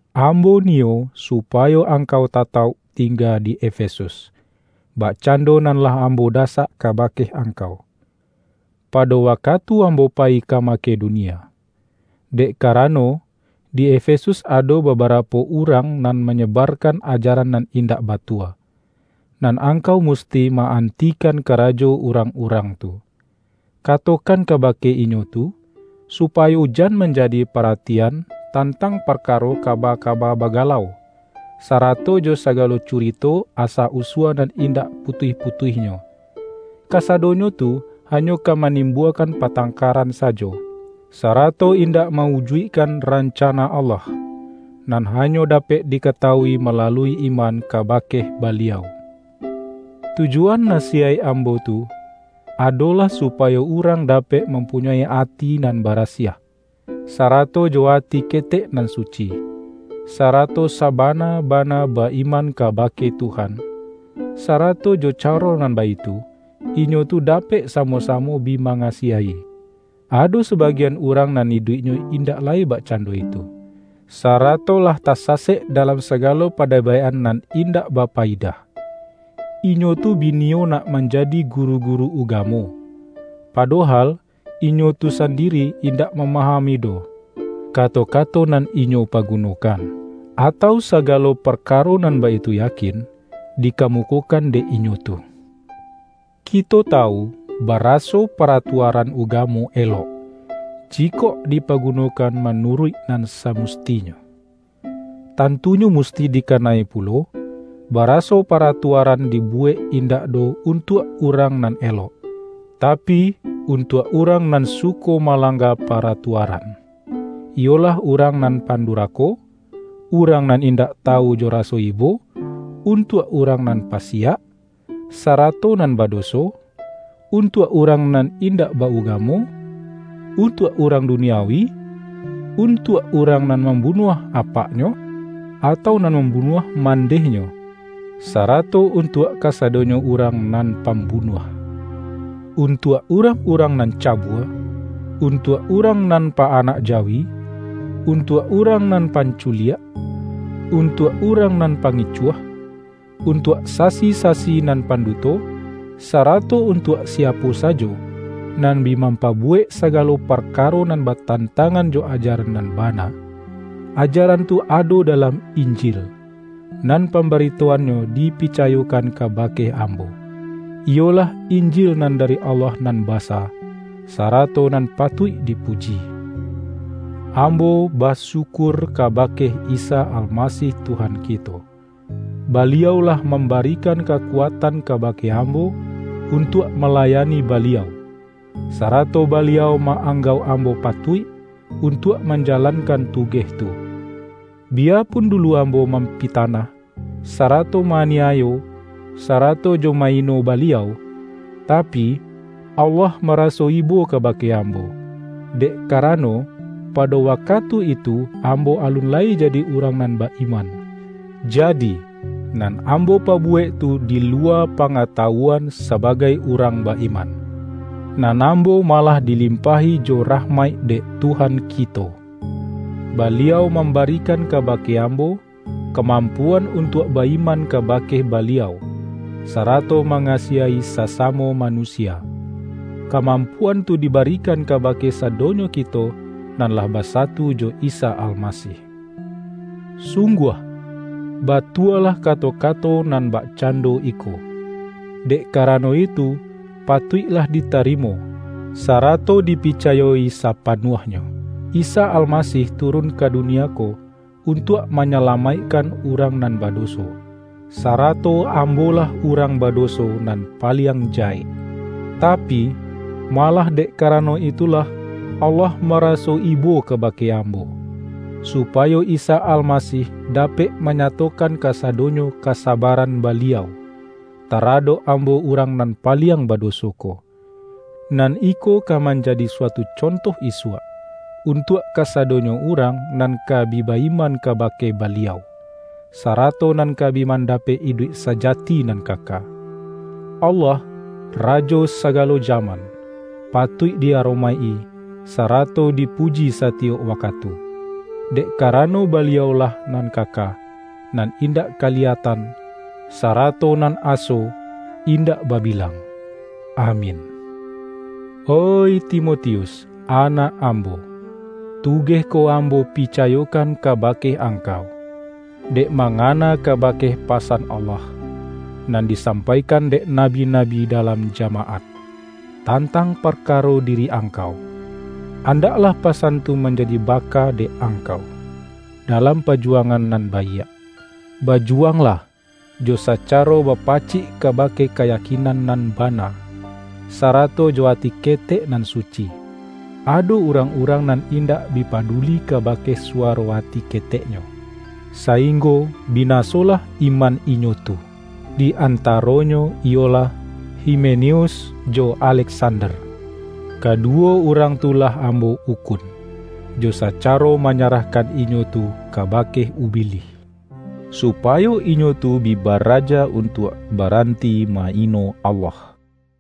Ambo niyo supayo angkau tatauk tingga di Efesus, bakcando nan lah am-bo dasak kabake angkau, pado waka-tu ambo payi ka Makedonia. Dek kara-no, di Efesus ado babarapo urang nan manyebarkan ajaran nan indak batua, nan angkau musti ma-antikan karajo urang-urang tu. Katokan kabake inyo tu, supayo jan manjadi paratian tan-tang parkaro kaba-kaba bagalau, sa-rato jo sagalo curito asa-usua nan in-dak putuih-putuihnyo. Kasadonyo tu hanyo ka manimbuakan patangkaran sajo, sarato indak ma-ujuikkan ranca-na Allah, nan hanyo dapek dikatawui malalui iman kabake Baliau. Tujuan nasiyaik ambo tu adolah supayo urang dapek mampunyoi ati nan barasiah, sa-rato jo ati ketek nan suci, sarato saba-na-bana ba-iman kabake Tuhan, sarato jo caro nan baitu, inyo tu dapek samo-samo bi mangasiahi. Ado sabagian urang nan iduiknyo indak lai bakcando itu, sarato lah tasasek dalam sagalo pa-debaik-an nan indak bapayidah. Inyo tu bi niyo nak manjadi guru-guru uga-mo, padohal, inyo tu sandiri indak mamahami doh, kato-kato nan inyo pagu-nokan, atau sagalo parkaro nan baitu yakin dikamukokan dek inyo tu. Kito tawu baraso paratuaran uga-mo elok, jikok dipagunokan manuruik nan samustinyo. Tantunyo musti di-kana-i pulo, baraso paratuaran dibu-wek indak doh untuak urang nan elok, tapi, untuak urang nan suko malang-ga paratuaran, iyolah urang nan pan-durako, urang nan indak tawu jo raso ibo, untuak urang nan pasiak, sarato nan badoso, untuak urang nan indak ba-ugamo, untuak urang duniawi, untuak urang nan mambunuah apak-nyo, atau nan mambunuah mandeh-nyo, sarato untuak kasadonyo urang nan pambunuah, untuak urang-urang nan cabua, untuak urang nan pa-anak jawi, untuak urang nan pan-culiak, untuak urang nan pangicuah; untuak sasi-sasi nan panduto, sarato untuak siapo sajo, nan bi mampabu-wek sagalo parkaro nan batantangan jo ajaran nan bana. Ajaran tu ado dalam Injil, nan pambaritoannyo di-picayokan kabake ambo, iyolah Injil nan dari Allah nan basa, sarato nan patuik dipuji. Ambo basyukur kabake Isa Almasih Tuhan kito. Baliau lah mam-barikan kakuatan kabake ambo un-tuak malayani Baliau, sarato Baliau ma-anggauk ambo patuik, untuak manjalankan tugeh tu, biyapun dulu ambo mampitanah, sarato ma-aniayo, sarato jo ma-ino Baliau. Tapi, Allah maraso ibo kabake ambo, dek karano, pado wakatu itu ambo alun lai jadi urang nan ba-iman, ja-di, nan ambo pabuwek tu di luwa pa-ngatawuan sabagai urang ba-iman. Nan ambo malah dilimpahi jo rah-maik dek Tuhan kito. Baliau mamba-rikan kabake ambo, kamampuan un-tuak ba-iman kabake Baliau, sarato mangasiahi sasamo manusia. Kamam-puan tu dibarikan kabake sadonyo kito nan lah basatu jo Isa Almasih. Sungguah, batualah kato-kato nan bakcando iko — dek karano itu patuik-lah ditarimo, sarato dipicayo-i sapa-nuahnyo —:”Isa Almasih turun ka du-nia ko untuak manyalamaikkan urang nan badoso.” Sarato ambolah urang badoso nan paliang jahek. Tapi, malah dek karano itulah Allah mara-so ibo kabake ambo, supayo Isa Alma-sih dapek manyatokan kasadonyo ka-sabaran Baliau, taradok ambo urang nan paliang badoso ko. Nan iko ka manjadi suatu conto isuak, untuak ka-sadonyo urang nan ka bi ba-iman ka-bake Baliau, sarato nan ka bi man-dapek iduik sajati nan kaka. Allah, Rajo sagalo jaman, patuik di-aro-maik-i, sarato dipuji satiyok wakatu, dek karano Baliau-lah nan kaka, nan indak kaliyatan, sarato nan aso, indak babilang! Amin. Oih Timotius, anak ambo! Tugeh ko ambo picayokan kabake angkau, dek mangana kabake pasan Allah, nan disampaikan dek nabi-nabi da-lam jamaat, tantang parkaro diri ang-kau. Andaklah pasan tu manjadi ba-ka dek angkau, dalam pajuwangan nan baiak. Bajuwanglah, jo saca-ro bapacik kabake kayakinan nan ba-na, sarato jo ati ketek nan suci. Ado urang-urang nan indak bi paduli ka-bake suwaro ati keteknyo, sainggo bi-nasolah iman inyo tu. Di antaro-nyo iyolah, Himeneus jo Aleksander. Kaduwo urang tu lah ambo ukun jo sacaro manyarahkan inyo tu kabake Ubilih, supayo inyo tu bi baraja un-tuak baranti ma-ino Allah.